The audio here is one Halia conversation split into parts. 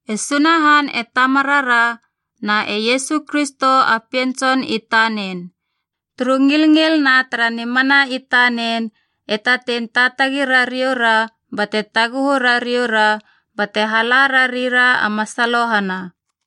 E Sunahan e Tamarara na e Iesu Kristo a Pien Tson i tanen, turu ngilngil na tara nimana i tanen, e tatei taatagi rariou ra bate taguhu rariou ra bate hala rari ra a masalohana.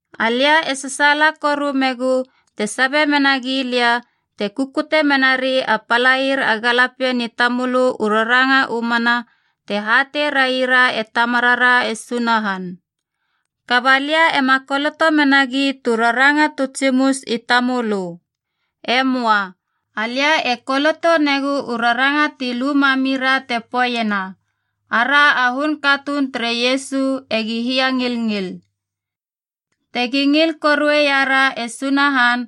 Alia e sasaala koru megu te sabe mena gilia, te kukute menari a palair a galapien i tamölö u raranga u mana te hatei raira e Tamarara e Sunahan. Kaba lia ema koloto menagi tu raranga tu tsimus i tamölö. E möa. Alia e koloto negu u raranga ti lu mamira te poeiena, ara a hun katuun tere Iesu egi hiangilngil. Tegi ngil korueia ra e Sunahan,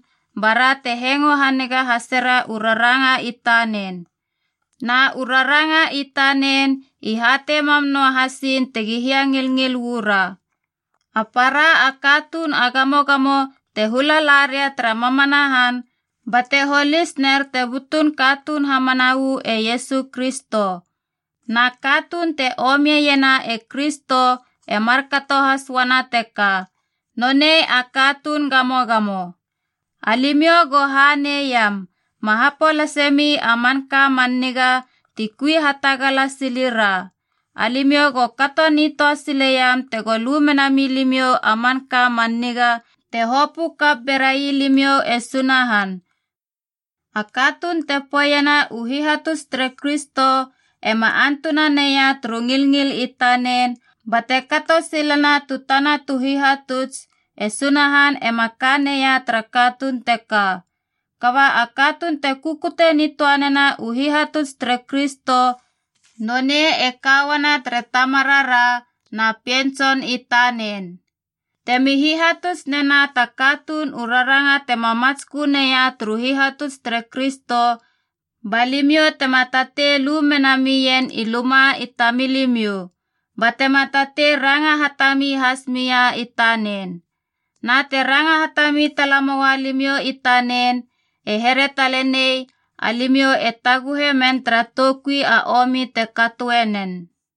bara te hengo haniga hasera u raranga i tanen. Na u raranga i tanen i hatei mam noahasin tegi hiangilngil uu ra. A para a katuun a gamogamo te hula la ria tara mamana han, bate holis ner te butun katuun hamana uu e Iesu Kristo. Na katuun te omiena e Kristo e markato has uana teka, nonei a katuun gamogamo. Alimiou go haneiam, ma hapolase mi a manka man niga ti kui hatagala sili ra. Alimiou go kato nitöa sileiam tego lu mena milimiou a manka man niga te hopö kap berai limiou e Sunahan. A katuun te poeiena u hihatuts tere Kristo ema antuna neia turu ngilngil i tanen bate kato silena u tana u hihatuts, e Sunahan ema ka neia tara katuun teka. Kaba a katuun te kukute nitöanena u hihatuts tere Kristo nonei e ka uana tere Tamarara na Pien Tson i tanen. Temi hihatuts nena ta katuun u raranga tema matskö neia turu hihatuts tere Kristo, ba limiou tema tatei lu mena mien i luma i tamilimiou, batema tatei ranga hatami has mia i tanen. Na te ranga hatami tala moua limiou i tanen, e here talenei alimiou e taguhe men tara toukui a omi te katoe nen.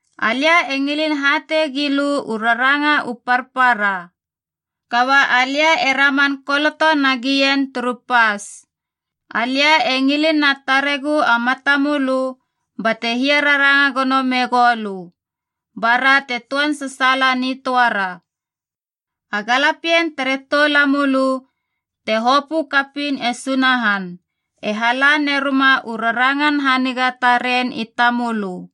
Alia e ngilin hatei gilö u raranga u parpara, kaba alia e raman koloto nagien turu pas. Alia e ngilin na taregu a matamölö bate hiararanga gono megou lö, bara te töan sasaala nitöara. A galapien tere toulamölö, te hopö kapiin e Sunahan, e hala neruma u rarangan haniga taren i tamölö.